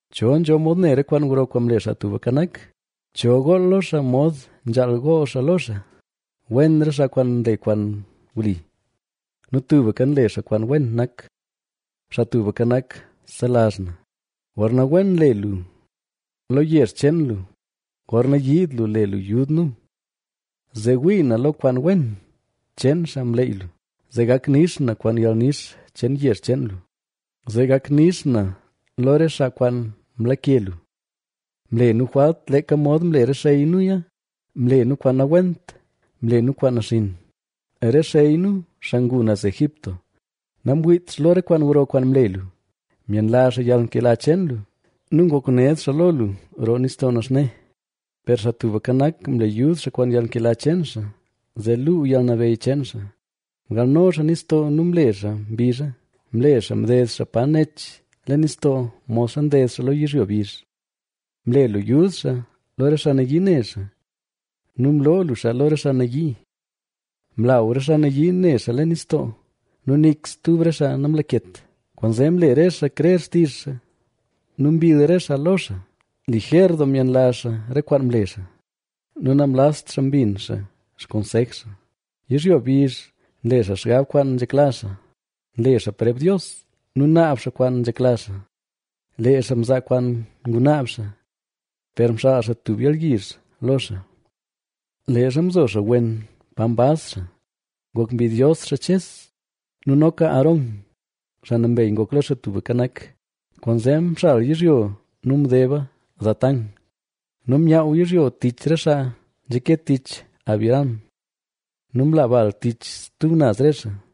¿Cho nzho mod ne re kwaan gro kwaan mle Xaa Tubka Nak? ¿Cho gool lo xaa mod nzhaal gool xaa lo xaa? Wen re xaa kwaan nle kwaan wli nu tubka nle xaa kwaan wen nak. Xaa Tubka Nak, selazh na, gorna wen le lu lo yezh cheen lu, gorna yiid lu le lu yud nu. Zee wii na lo kwaan wen cheen xaa mleyy lu, zee gak nix na kwaan yalnix cheen yezh cheen lu, Zee gak nix na lo re xaa kwaan mlake lu. Mle nu jwalt leeka mod mle re xey nuya; mle nu kwaan nawent, mle nu kwaan naxinn. Re xey nu, xaa ngu naz Egipto, namwiit xaa lo re kwaan gro kwaan mle lu; myenlazh xaa yalnkela cheen lu nu ngok ned xaa ne xaa lo lu roo Nistoo Naxne. Per Xaa Tubka Nak, mle yud xaa kwaan yalnkela cheen xaa, zee luu yalnabeyy cheen xaa. Mgalno xaa nistoo nu mle xaa mbizha, mle xaa mded xaa pa nech leen nistoo modxa nded xaa lo yizhyo bizh. Mle lu yud xaa lo re xaa nayii ne xaa nu mloo lu xaa lo re xaa nayii. Mlaw re xaa nayii ne xaa leen nistoo nu nik stub re xaa namlaket. Kwaanzee mle re xaa krer xtizh xaa nu mbill re xaa lo xaa. Lijer doo myenlazh xaa re kwaan mle xaa nu namlazt xaa mbin xaa xkonsej xaa. Yizhyo bizh nle xaa xgab kwaan nzhekla xaa, nle xaa preb Dios nu naab xaa kwaan nzhekla xaa. Lee xaa mzaa kwaan ngunaab xaa, per mxaal xaa tub yalyizh lo xaa. Leezha mzo xaa wen pa mbaz xaa, ngok mbidyos xaa Ches nu noka Aarón, xaa nambey ngok lo Xaa Tubka Nak. Kwaanzee mxal yizhyo nu mdeba Datán nu myaaw yizhyo tich re xaa nzhake tich Abiram. Nu mla bal tich stub naz re xaa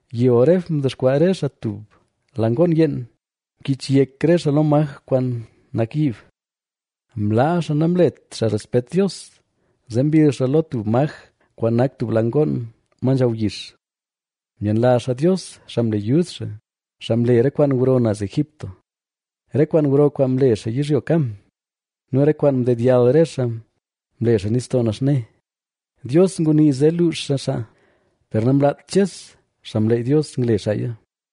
Yi Horeb mdexkwaa re xaa tub la ngoon yeen, mkich yek re xaa lo maj kwaan nak yiib. Mlaa xaa namlet xaa respet Dios, zee mbill xaa lo tub maj kwaan nak tub la ngoon ma nzhaw yix. Myenlazh xaa Dios xaa mle yud xaa, xaa mle re kwaan gro naz Egipto, re kwaan gro kwaan mle xaa yizhyo Cam nu re kwaan mdedyall re xaa mle xaa Nistoo Naxne. Dios ngunii zee luux xaa xaa, per namlaat Ches, xaa mleyy Dios, ngle xaaya,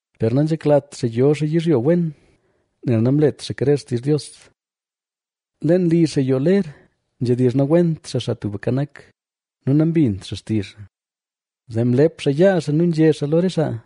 Per nanzheklat xaa yo xaa yizhyo wen, nel namlet xaa krer xtizh Dios. Leen li xaa yoo ler, nzhedizh nawent xaa Xaa Tubka Nak nu nambint xaa xtizh xaa. Zee mlep xaa yaa xaa nu nzhé xaa lo re xaa,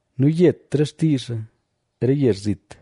nu yet re xtii xaa re yezh zit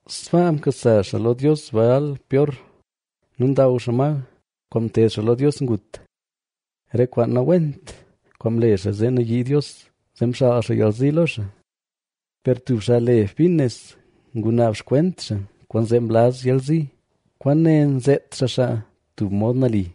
Sbaa mkasa xaa lo dios Baal Peor, nu ndaw xaa ma kwaan mted xaa lo dios ngut. Re kwaan nawent kwaan mle xaa, zee nayii Dios, zee mxaal xaa yalzi lo xaa. Per tub xaa le Finees ngunaab xkwent xaa, kwaanzee mlaz yalzi. Kwaane nzeet xaa xaa tub mod nali,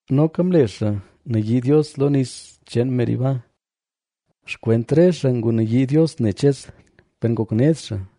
Noka mle xaa nayii Dios lo nis cheen Meriba; xkwent re xaa ngunayii Dios ne Ches, per ngok ned xaa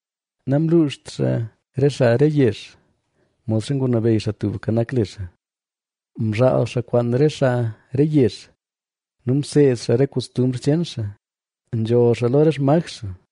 Namluuxt xaa re xaa re yezh, modxa ngunabeyy Xaa Tubka Nak le xaa. Mzhaal xaa kwaan re xaa re yezh nu mseed xaa re kostumbr cheen xaa. Nzholl xaa lo re xmaj xaa,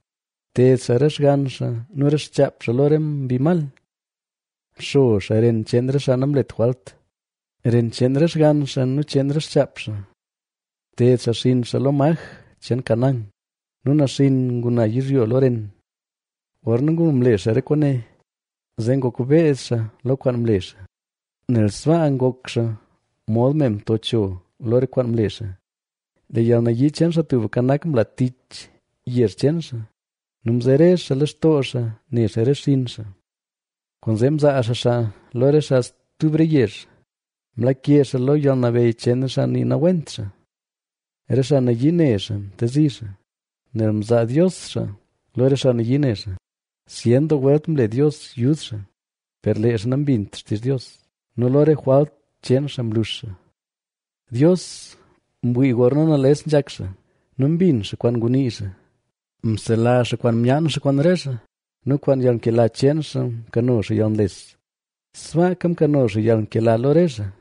Mted xaa re xgann xaa nu re xchaap xaa lo re mbi mal.h Mxo xaa ren cheen re xaa namlet jwalt, ren cheen re xgann xaa nu cheen re xchaap xaa.i Mted xaa xinn xaa lo maj cheen Canaán nu naxinn nguna yizhyo lo ren. Gorna ngulo mle xaa re kwaane, zee ngok beed xaa lo kwaan mle xaa, nel sbaa ngok xaa mod me mto cho lo re kwaan mle xaa. Lee yalnayii cheen Xaa Tubka Nak, mla tich yezh cheen xaa nu mzere xaa lextoo xaa ne xaa re xinn xaa. Kwaanzee mzaa xaa xaa lo re xaa stub re yezh, mlake xaa lo yalnabeyy cheen xaa nii nawent xaa. Re xaa nayii ne xaa mtezi xaa, nel mzaa Dios xaa lo re xaa nayii ne xaa. Zyen doo welt mle Dios yud xaa, per lee xaa nambint xtizh Dios nu lo re jwalt cheen xaa mlux xaa. Dios mwii gorna nales nzhak xaa nu mbin xaa kwaan ngunii xaa; selazh xaa kwaan myaan xaa kwaan re xaa, nu kwaan yalnkela cheen xaa mkano xaa yalnles. Sbaaka mkano xaa yalnkela lo re xaa,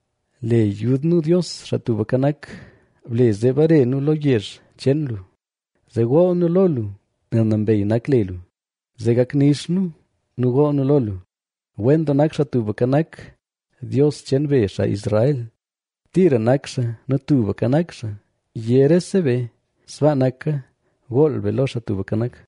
Le yud nu Dios, Xaa Tubka Nak, ble zee bare nu lo yezh cheen lu, zee gool nu lo lu nel nambey nak le lu, zee gak nix nu gool nu lo lu. ¡Wen doo nak Xaa Tubka Nak, Dios cheen be, xaa Israel, tira nak xaa nu tubka nak xaa! ¡Yé rese be: “Sbaa naka”! Gool be lo Xaa Tubka Nak.